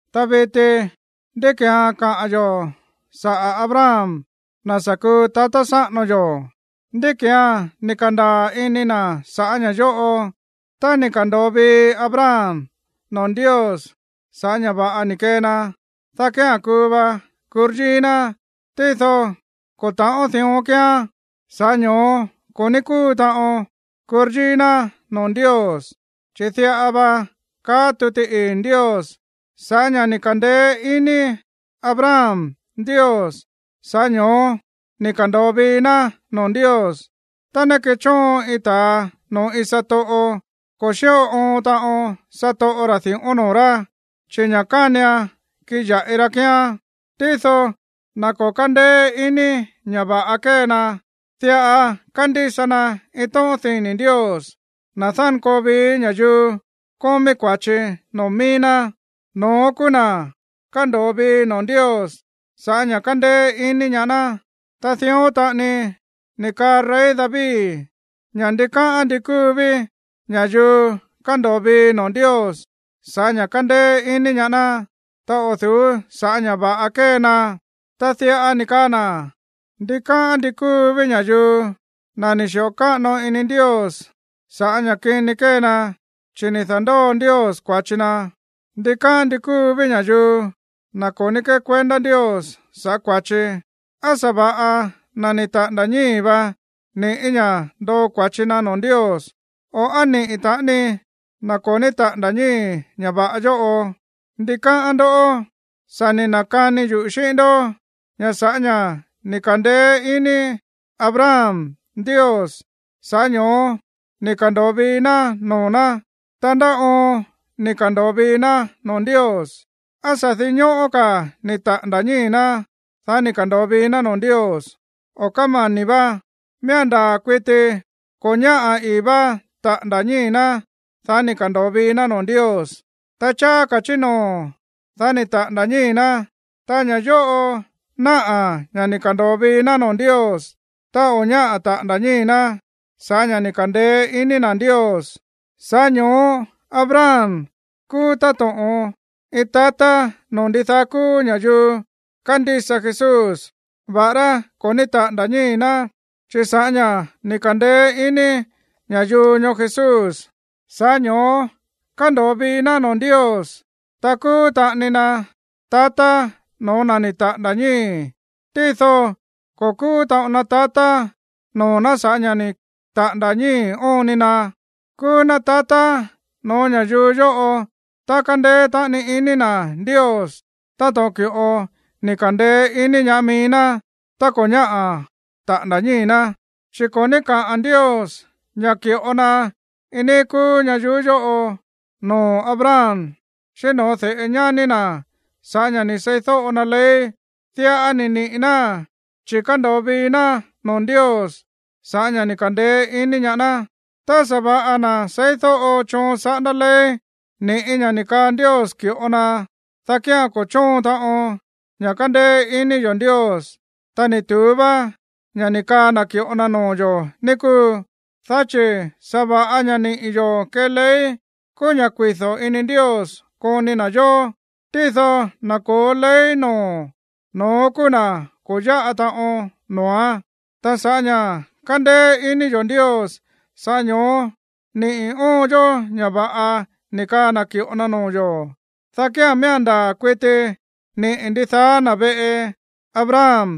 Ta viti, ¿ndí ki̱án kaa yo̱ sa̱ꞌá Abraham, na̱ sa̱ kuu tatá sáꞌano yo̱? ¿Ndí ki̱án ni̱ ka̱ndaa̱ ini na̱ saꞌa̱ ña̱ yóꞌo? Tá ni̱ ka̱ndo̱o vii Abraham noo̱ Ndios sa̱ꞌá ña̱ va̱ꞌa ni̱ kee na, dá kía̱n kuu va kuryíí ná. Tído ko̱ ta̱ꞌón dión kíán, sa̱ꞌá ño̱ó ko̱ ní kúu taꞌon kuryíí ná noo̱ Ndios. Chi̱ diꞌa va káꞌa̱n tuti ii̱ Ndios: “Sa̱ꞌá ña̱ ni̱ ka̱ndeé ini Abraham Ndios, sa̱ꞌá ño̱ó ni̱ ka̱ndo̱o vii ná noo̱ Ndios.” Tá ná kéchóon iin ta̱a noo̱ iin satoꞌo, ko̱ xíꞌo oon taꞌon satoꞌo ra̱ di̱ꞌón noo̱ rá, chi̱ ña̱ kánian kiꞌin ya̱ꞌi ra kíán. Tído na̱ ko̱ kándeé ini ña̱ va̱ꞌa kée na, diꞌa kándísa na iin tóꞌón dini̱ Ndios, na̱ dánkoo vií ña̱yuu kómí kua̱chi noo̱ mií ná, no̱ón kúú na̱ kándo̱o vii noo̱ Ndios sa̱ꞌá ña̱ kándéé iní ñaá ná. Ta dión taꞌani ni̱ kaa rey David ña̱ ndikáꞌán ndi kúu ví ña̱yuu kándo̱o vii noo̱ Ndios sa̱ꞌá ña̱ kándéé iní ñaá ná, ta o̱ du̱ú sa̱ꞌá ña̱ va̱ꞌa kée na. Ta diꞌa ni̱ kaa na̱: Ndikáꞌán ndí kúu ví ña̱yuu, na̱ ni̱ xi̱ꞌo káꞌano ini Ndios saꞌa̱ ña̱ kini kée na, chi̱ ni̱ da̱ndóo Ndios kua̱chi na̱. Ndikáꞌán ndi kúu ví ña̱yuu, na̱ ko̱ ní kekuendá Ndios sa̱ꞌá kua̱chi. ¿Á sa̱va̱ꞌa na̱ ni̱ taꞌa̱nda̱ ñíi̱ vá ni̱ꞌí ña̱ ndoo kua̱chi na noo̱ Ndios, o á niꞌi̱ taꞌani na̱ ko̱ ní taꞌa̱nda̱ ñíi̱ ña̱ va̱ꞌa yóꞌo? ¿Ndi káꞌán ndó? Sa̱ ni̱ na̱kani yuꞌu̱ xíꞌín ndó ña̱ sa̱ꞌá ña̱ ni̱ ka̱ndeé iní Abraham Ndios, sa̱ꞌá ño̱ó ni̱ ka̱ndo̱o vii ná noo̱ ná. Ta, ¿ndá oon ni̱ ka̱ndo̱o vii ná noo̱ Ndios? ¿Á sa̱ dinñóꞌó ka̱ ni̱ taꞌa̱nda̱ ñíi̱ ná, dá ni̱ ka̱ndo̱o vii ná noo̱ Ndios, o kómani̱ vá? Miía̱n ndaa̱ kuiti ko̱ ñáꞌa̱ ii̱ vá taꞌa̱nda̱ ñíi̱ ná, dá ni̱ ka̱ndo̱o vii ná noo̱ Ndios. Ta cháá ka̱ chí noo̱, dá ni̱ taꞌa̱nda̱ ñíi̱ ná. Ta ña̱ yóꞌo náꞌa̱ ña̱ ni̱ ka̱ndo̱o vii ná noo̱ Ndios tá o̱ ñáꞌa̱ taꞌa̱nda̱ ñíi̱ ná sa̱ꞌá ña̱ ni̱ ka̱ndeé iní na̱ Ndios. Sa̱ꞌá ño̱ó Abraham kúú táto̱ꞌon iin tatá noo̱ ndidaá kúú ña̱yuu kándísa Jesús, va̱ꞌará ko̱ ní taꞌa̱nda̱ ñíi̱ ná, chi̱ sa̱ꞌá ña̱ kándeé iní ña̱yuu ñoó Jesús, sa̱ꞌá ño̱ó kándo̱o vii ná noo̱ Ndios. Ta kúú taꞌani na tatá no̱ó na̱ ni̱ taꞌa̱nda̱ ñíi̱. Tído ko̱ kúú taꞌon na tatá noo̱ ná sa̱ꞌá ña̱ ni̱ taꞌa̱nda̱ ñíi̱ óon ni na. Kúú ná tatá noo̱ ñayuú yóꞌo tá kándéé taꞌani ini na̱ Ndios táto̱ꞌon ki̱ꞌo ni̱ ka̱ndeé iní ñaá mií ná tá ko̱ ñáꞌa̱ taꞌa̱nda̱ ñíi̱ ná. Chi̱ ko̱ ní kaá Ndios ña̱ ki̱ꞌo na iin níí kúú ñayuú yóꞌo noo̱ Abraham xíꞌín no̱ó de̱ꞌe ñání na̱ sa̱ꞌá ña̱ ni̱ seídóꞌo na ley. Diꞌa ni̱ niꞌi̱ náa̱n chi̱ ni̱ ka̱ndo̱o vii ná noo̱ Ndios sa̱ꞌá ña̱ ni̱ ka̱ndeé iní ñaá ná. Tá sa̱va̱ꞌa na̱ seídóꞌo choon saꞌándá ley ni̱ꞌí ña̱ ni̱ kaa Ndios ki̱ꞌo na, dá kía̱n ko̱ chóon taꞌon ña̱ kándéé ini yo̱ Ndios, ta ni̱ tu̱ú vá ña̱ ni̱ kaa na̱ ki̱ꞌo na noo̱ yo̱, ní kúu. Dá chi̱ sa̱va̱ꞌa ña̱ niꞌi̱ yo̱ kée ley kúú ña̱ kuido̱ ini Ndios koni na̱ yó. Tído na̱ ko̱ó ley noo̱, no̱ón kúú na̱ ko̱ yáꞌa taꞌon noo̱án. Ta sa̱ꞌá ña̱ kándéé ini yo̱ Ndios, sa̱ꞌá ño̱ó niꞌi̱ óon yó ña̱ va̱ꞌa ni̱ kaa na̱ ki̱ꞌo na noo̱ yo̱, dá kía̱n miía̱n ndaa̱ kuiti niꞌi̱ ndidaá na̱ veꞌe Abraham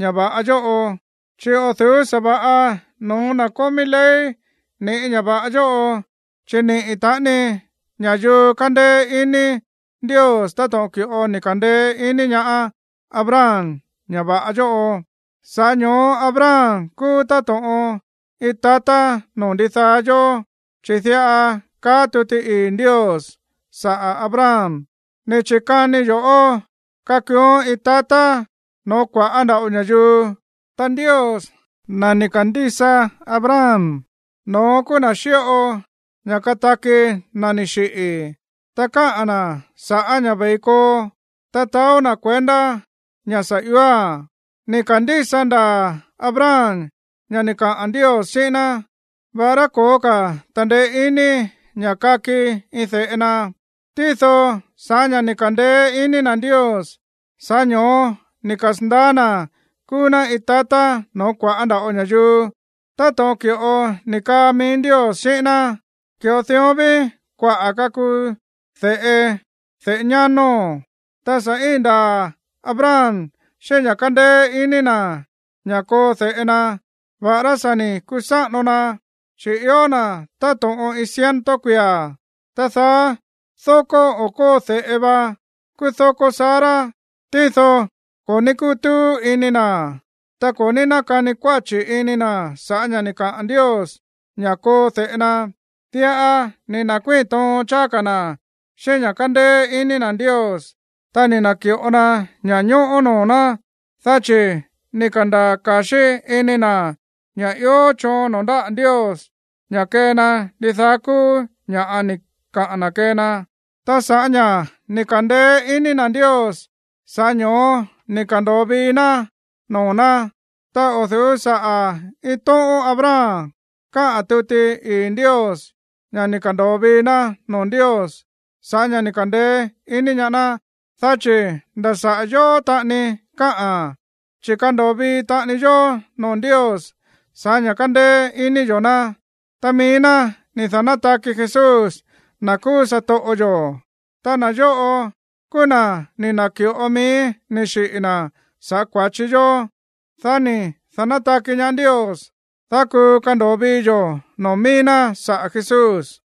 ña̱ va̱ꞌa yóꞌo. Chi̱ o̱ du̱ú sa̱va̱ꞌa no̱ó na̱ kómí ley ni̱ꞌí ña̱ va̱ꞌa yóꞌo, chi̱ niꞌi̱ taꞌani ña̱yuu kándéé ini Ndios táto̱ꞌon ki̱ꞌo ni̱ ka̱ndeé ini ñaá Abraham ña̱ va̱ꞌa yóꞌo. Sa̱ꞌá ño̱ó Abraham kúú táto̱ꞌon iin tatá noo̱ ndidaá yó. Chi̱ diꞌa kaá tuti ii̱ Ndios saꞌa̱ Abraham: “Ni̱ chi̱kanii yo̱ꞌó kakuuón iin tatá no̱ó kua̱ꞌá nda̱ꞌo ña̱yuu.” Ta Ndios, na̱ ni̱ ka̱ndísa Abraham, no̱ón kúú na̱ xíꞌo ña̱ kataki na̱ ni̱ xiꞌi̱, ta káꞌa̱n na̱ sa̱ꞌá ña̱ ve̱i koo, ta taó na̱ kuendá ña̱ sa̱ ióa̱n. Ni̱ ka̱ndísa ndaa̱ Abraham ña̱ ni̱ kaꞌa̱n Ndios xíꞌín ná, va̱ꞌará ko̱ó ka̱ ta̱ndeé iní ña̱ kaki iin de̱ꞌe na. Tído sa̱ꞌá ña̱ ni̱ ka̱ndeé ini na̱ Ndios, sa̱ꞌá ño̱ó ni̱ kasa̱ndaá na̱ kúú ná iin tatá no̱ó kua̱ꞌá nda̱ꞌo ña̱yuu, táto̱ꞌon ki̱ꞌo ni̱ kaa mií Ndios xíꞌín ná: “Ki̱ꞌo dión ví kuaꞌa̱ kakuu de̱ꞌe de̱ꞌe ñánóo̱n.” Ta sa̱ íin ndaa̱ Abraham xíꞌín ña̱ kándéé ini na̱ ña̱ koo de̱ꞌe na, va̱ꞌará sa̱ ni̱ kusáꞌano na, chi̱ ió na̱ táto̱ꞌon iin ciento kuia̱. Ta daá dókó o̱ kóo de̱ꞌe va kúú dókó Sara. Tído ko̱ ní kútúú ini na̱, ta ko̱ ní nákani kuáchi̱ ini na̱ sa̱ꞌá ña̱ ni̱ kaꞌa̱n Ndios ña̱ koo de̱ꞌe na. Diꞌa ni̱ na̱kuíi̱n toon cháá ka̱ na̱ xíꞌín ña̱ kándéé iní na̱ Ndios. Ta ni̱ na̱ki̱ꞌo na ña̱ñóꞌó noo̱ ná. Dá chi̱ ni̱ ka̱ndaa̱ ka̱xí ini na̱ ña̱ ió choon noo̱ ndáꞌa̱ Ndios ña̱ kee na ndidaá kúú ña̱ꞌa ni̱ kaa na̱ kee na. Ta sa̱ꞌá ña̱ ni̱ ka̱ndeé iní na̱ Ndios, sa̱ꞌá ño̱ó ni̱ ka̱ndo̱o vii ná noo̱ ná. Ta o̱ du̱ú saꞌa̱ iin tóꞌón Abraham káꞌa̱n tuti ii̱ Ndios ña̱ ni̱ ka̱ndo̱o vii ná noo̱ Ndios sa̱ꞌá ña̱ ni̱ ka̱ndeé ini ñaá ná, dá chi̱ nda̱ saꞌa̱ yóó taꞌani káꞌa̱n, chi̱ kándo̱o vii taꞌani yó noo̱ Ndios sa̱ꞌá ña̱ kándéé iní yo̱ ná, ta mií ná ni̱ da̱nátaki Jesús, na̱ kúú satoꞌo yo̱. Ta na̱ yóꞌo kúú na̱ ni̱ na̱ki̱ꞌo mií ni̱ xiꞌi̱ na̱ sa̱ꞌá kua̱chi yó. Dá ni̱ da̱nátaki ñaá Ndios, dá kuu kando̱o vii yo̱ noo̱ mií ná saꞌa̱ Jesús.